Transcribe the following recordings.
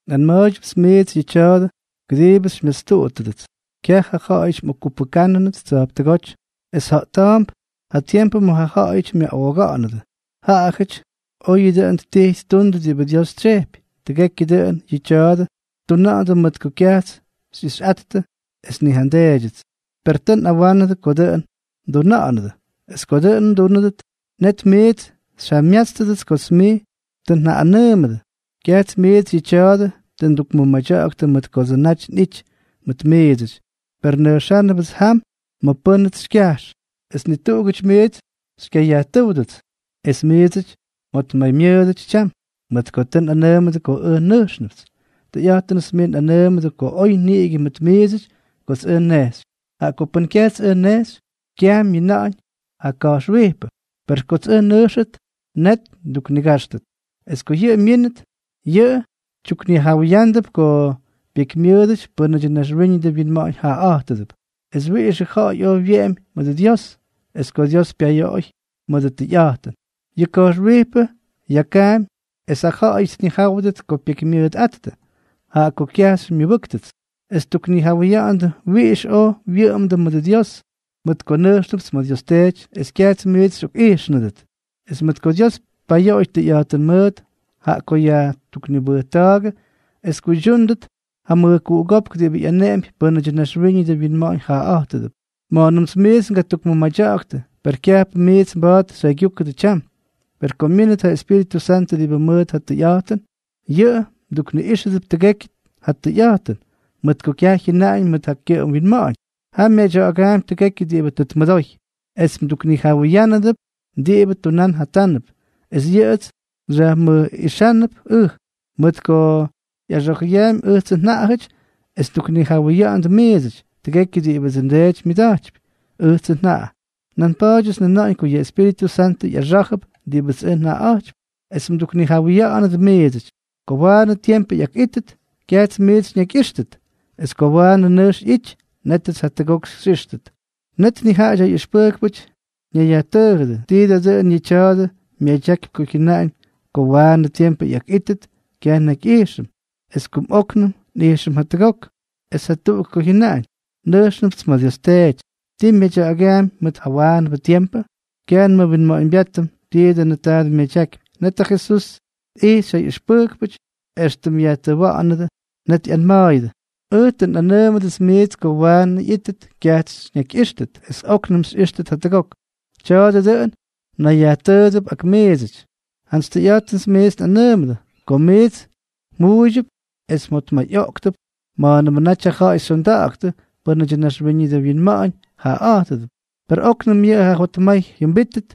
’Nꞌanma̱a̱ydyʉpts miits yʉ tya̱a̱dʉ kʉdiibʉ xymyastuꞌuttʉdʉts. Kyaj ja ja̱ꞌa̱yʉty mꞌokkupʉjkʉnʉt tsa̱jptʉgóty, es ja̱ꞌta̱a̱mp ja tiempʉ ma̱ ja ja̱ꞌa̱yʉty myaꞌooga̱ꞌa̱nʉdʉ. Jaꞌajʉty oyʉ dʉn ttijy ttundʉ diꞌibʉ Dios tsyejpy. Tʉgekyʉ dʉꞌʉn yʉ tya̱a̱dʉ ttuna̱ꞌa̱ndʉ mʉt ko kyajts xyꞌixyꞌattʉ es ni ja nDeedyʉts. Per tʉʉ nꞌawánʉdʉ ko dʉꞌʉn mduna̱ꞌa̱nʉdʉ. Es ko dʉꞌʉn mdúnʉdʉt, net miits xyjamyátstʉdʉts kots mij tʉ njaꞌꞌanʉʉmʉdʉ. ’Kyajts miits yʉ tya̱a̱dʉ tʉ ndukmʉmadya̱ꞌa̱ktʉ mʉt kodsʉ naty nꞌity mʉt miidsʉty. Per nʉjxánʉpts jam ma̱ pʉ́nʉts xykyajx, es ni tuꞌugʉty miits xykyayajtʉ́wdʉdʉts: “¿Ma̱ mnejxy?” Es miits mjotmaymyʉʉdʉty tyam, mʉt ko tʉ nꞌanʉʉmʉdʉ ko ʉj nʉjxnʉpts. Tʉyꞌa̱jtʉnʉts miits nꞌanʉʉmʉdʉ ko oy niꞌigʉ mʉt miidsʉty kots ʉj nnejxy. Jaꞌa ko pʉn kyajts ʉj nnejxy, kyaj myina̱ꞌa̱ñ ja Ka̱jxwijpʉ, per kots ʉj nnʉjxnʉt, net nduknigáxtʉt. Es ko yʉꞌʉ myínʉt, yʉꞌʉ tyuknijawʉyándʉp ko pyekymyʉʉdʉty pʉ́nʉdyʉ naxwíñʉdʉ winma̱ꞌa̱ñ jaꞌaꞌa̱jtʉdʉp, es wiꞌixʉ ja̱ꞌa̱y oy wyeꞌemy mʉdʉ Dios, es ko Dios pyayoꞌoy mʉdʉ tʉyꞌa̱jtʉn. Yʉ Ka̱jxwijpʉ yakaampy es ja ja̱ꞌa̱yʉty tnijáwʉdʉt ko pyekymyʉʉtꞌáttʉ, jaꞌa ko kyaj xymyʉbʉ́ktʉts, es ttuknijawʉya̱ꞌa̱ndʉ wiꞌix oy wyʉꞌʉmdʉ mʉdʉ Dios, mʉt ko nʉjxnʉpts ma̱ Dios Teety es kyajts miits xyꞌokꞌijxnʉdʉt, es mʉt ko Dios pyayoꞌoy tʉyꞌa̱jtʉn mʉʉt, jaꞌa ko tʉ yajtuknibʉjta̱a̱gʉ es tyʉydyúnʉdʉt ja mʉjkuꞌugópk diꞌibʉ ꞌyaneꞌempy pʉ́nʉdyʉ naxwíñʉdʉ winma̱ꞌa̱ñ jaꞌaꞌa̱jtʉdʉp. ’Máyñʉmts miits ngatukmʉmadya̱ꞌa̱ktʉ, per kyajpʉ miits mba̱a̱t xyjaygyúkʉdʉ tyam. Per ko myínʉt ja Espíritʉ Santʉ diꞌibʉ mʉʉt ja tʉyꞌa̱jtʉn, yʉꞌʉ mdukniꞌíxʉdʉp tʉgekyʉ ja tʉyꞌa̱jtʉn, mʉt ko kyaj jyʉna̱ꞌa̱na̱ꞌa̱ñ mʉt ja kyʉꞌʉm winma̱ꞌa̱ñ. Jaꞌa myadya̱ꞌa̱gaampy tʉgekyʉ diꞌibʉ tʉ tmʉdoy, es mduknijawʉyánʉdʉp diꞌibʉ tunán jatánʉp. Es yʉꞌʉts xyajmʉjꞌixánʉp ʉj, mʉt ko ꞌyaxa̱jʉyaampy ʉjtsʉ njaꞌajʉty es mduknijawʉya̱ꞌa̱nʉdʉ miidsʉty. Tʉgekyʉ diꞌibʉdsʉ nDeety myʉda̱jtypy, ʉjtsʉ njaꞌa. Nan pa̱a̱dyʉts njʉnáñ ko yʉ Espíritʉ Santʉ ꞌyaxá̱jʉp diꞌibʉts ʉj njaꞌaꞌa̱jtypy es mduknijawʉya̱ꞌa̱nʉdʉ miidsʉty. ’Ko waanʉ tiempʉ ꞌyakꞌítʉt, kyajts miits xyñakyꞌíxtʉt. Es ko waanʉ nʉjx ꞌyity, nétʉts jatʉgok xyꞌíxtʉt. Net nijaꞌajʉty ja ꞌyʉxpʉjkpʉty ñayyajtʉʉjʉdʉ: —¿Ti da dʉꞌʉn yʉ tya̱a̱dʉ myadyakypy ko jyʉnaꞌañ ko waanʉ tiempʉ ꞌyakꞌítʉt kyaj nnakyꞌijxʉm, es kumꞌóknʉm nꞌijxʉm jatʉgok, es jatuꞌuk ko jyʉnaꞌañ: “Nʉjxnʉpts ma̱ Dios Teety?” ¿Ti myadya̱ꞌa̱gaampy mʉt jawaanʉbʉ tiempʉ? Kyaj nmʉwinma̱ꞌa̱ñbyátʉm ti dʉnʉ taadʉ myadyakypy. Net ja Jesús tꞌijxy ja ꞌyʉxpʉjkpʉty éxtʉm yajtʉwa̱ꞌa̱nʉdʉ. Net tꞌanma̱a̱ydyʉ: —Ʉj tʉ nꞌanʉʉmʉdʉts miits ko waanʉ ꞌyítʉt kyajts xyñakyꞌíxtʉt, es óknʉm xyꞌíxtʉt jatʉgok. ¿Tya̱a̱dʉ dʉꞌʉn mnayyajtʉʉdʉp ak miidsʉty? Jantsy tʉyꞌa̱jtʉn miits nꞌanʉʉmʉdʉ, ko miits mjʉꞌʉydyʉp es mjotmayꞌooktʉp ma̱a̱nʉmʉ naty ja ja̱ꞌa̱y xyonda̱ꞌa̱ktʉ pʉ́nʉdyʉ naxwíñʉdʉ winma̱ꞌa̱ñ jaꞌaꞌa̱jtʉdʉp. Per óknʉm yʉ mjotmay jʉmbítʉp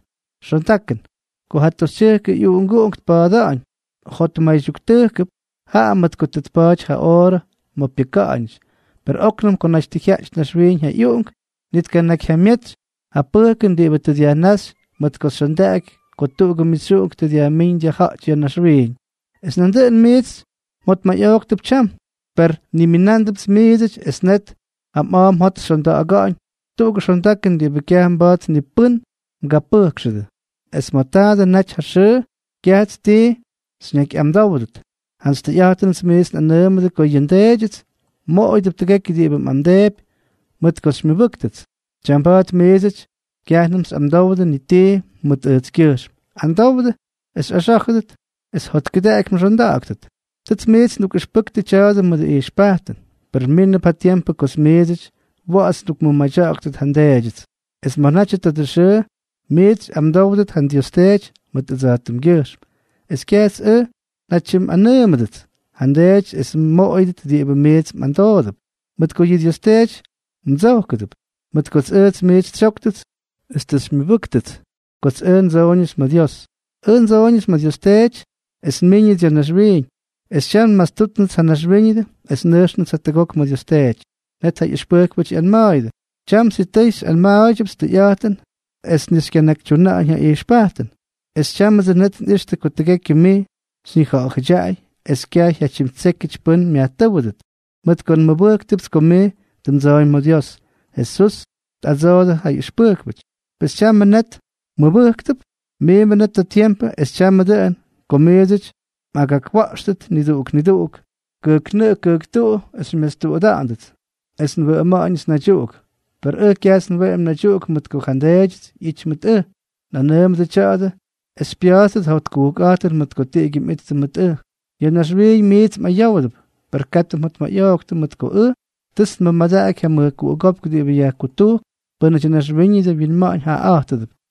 xondakʉn. Ko ja toxytyʉjk ꞌyuꞌunguꞌunk tpa̱a̱da̱ꞌa̱ñ, jotmaydyuktʉjkʉp, jaꞌa mʉt ko tʉ tpa̱a̱ty ja oorʉ ma̱ pyʉka̱ꞌa̱ñʉty. Per óknʉm ko naty tʉ jyaꞌty naxwiiñ ja uꞌunguꞌunk, ni tkanakyjyamyetsy ja pʉjkʉn diꞌibʉ tʉ dyajnáxy mʉt ko xyondaꞌaky ko tuꞌugʉ mixyuꞌunk tʉ dyajmíñ dyajja̱ꞌty ya̱ naxwiiñ. Es nandʉꞌʉn dʉn miits mjotmayꞌoꞌktʉp tyam, per nniminándʉpts miidsʉty, es net ja mꞌa̱a̱ mjot xyonda̱ꞌa̱ga̱ꞌa̱ñ tuꞌugʉ xondakʉn diꞌibʉ kyaj mba̱a̱t ni pʉ́n mgapʉjkxʉdʉ. ’Es ma̱ tadʉ naty ja xʉʉ, kyajts ti xyñakyꞌamdówʉt. Jantsy tʉyꞌa̱jtʉnʉts miits nꞌanʉʉmʉdʉ ko yʉ nDeedyʉts mmoꞌoyʉdʉp tʉgekyʉ diꞌibʉ mꞌamdeepy mʉt ko xymyʉbʉ́ktʉts. Tyamba̱a̱t miidsʉty kyajnʉm xyꞌamdowdʉ ni tii mʉt ʉjtskyʉjxm. Amdowdʉ, es xyꞌaxá̱jʉdʉt, es jotkʉdaꞌaky mxonda̱ꞌa̱ktʉt. ’Tʉts miits ndukꞌʉxpʉktʉ tya̱a̱dʉ mʉdʉ ijxpajtʉn. Per mínʉp ja tiempʉ kots miidsʉty wa̱ꞌa̱ts ndukmʉmadya̱ꞌa̱gʉt ja nDeedyʉts. Es ma̱ natyʉ tadʉ xʉʉ, miits xyꞌamdówdʉt ja Dios Teety mʉt ʉjtskyʉjxm. Es kyajts ʉj njatyimꞌanʉʉmʉdʉts ja nDeedyʉts es mmoꞌoyʉdʉt diꞌibʉ miits mꞌamdoodʉp, mʉt ko yʉ Dios Teety mdsojkʉdʉp, mʉt kots ʉj miits xytsyóktʉts es tʉ xymyʉbʉ́ktʉts kots ʉj ndsoꞌoñʉts ma̱ Dios. Ʉj ndsoꞌoñʉts ma̱ ja Dios Teety es nmiiñʉts ya̱ naxwiiñ, es tyam nmastútnʉts ja naxwíñʉdʉ es nnʉjxnʉts jatʉgok ma̱ Dios Teety. Net ja ꞌyʉxpʉjkpʉty ꞌyanma̱a̱yʉdʉ: —Tyam sitʉy xyꞌanma̱a̱ydyʉpts tʉyꞌa̱jtʉn es ni xykyanakyyajtúñ ja ijxpajtʉn. Es tyámʉdsʉ net nꞌixtʉ ko tʉgekyʉ mij xyñija̱ꞌa̱dyaꞌay, es kyaj jyatyimtsékyʉty pʉ́n myajtʉ́wʉdʉt, mʉt ko nmʉbʉjktʉpts ko mij tʉ mdsooñ ma̱ Dios. Jesús tꞌadsoodʉ ja ꞌyʉxpʉjkpʉty: —Pes, ¿tyamʉ net mmʉbʉjktʉp? Miimbʉ net ja tiempʉ, es tyamʉ dʉꞌʉn, ko miits mꞌagakwa̱ꞌxtʉt niduꞌuk niduꞌuk kʉjknʉꞌʉ kʉjktuꞌu es xymyastuꞌuda̱ꞌa̱ndʉts, es nwʉꞌʉma̱ꞌa̱ñʉts naydyuꞌuk. Per ʉj kyajts nweꞌemy naydyuꞌuk mʉt ko ja nDeedyʉts ꞌyity mʉt ʉj. Nꞌanʉʉmʉdʉ tya̱a̱dʉ es xypya̱a̱ttʉt ja jotkujkꞌa̱jtʉn mʉt ko tiꞌigyʉ mꞌittʉ mʉt ʉj. Ya̱ naxwiiñ miits mꞌayówdʉp, per katʉ mjotmayꞌooktʉ, mʉt ko ʉj, tʉts nmʉmadaꞌaky ja mʉjkuꞌugópk diꞌibʉ yajkutujkp pʉ́nʉdyʉ naxwíñʉdʉ winma̱ꞌa̱ñ jaꞌaꞌa̱jtʉdʉp.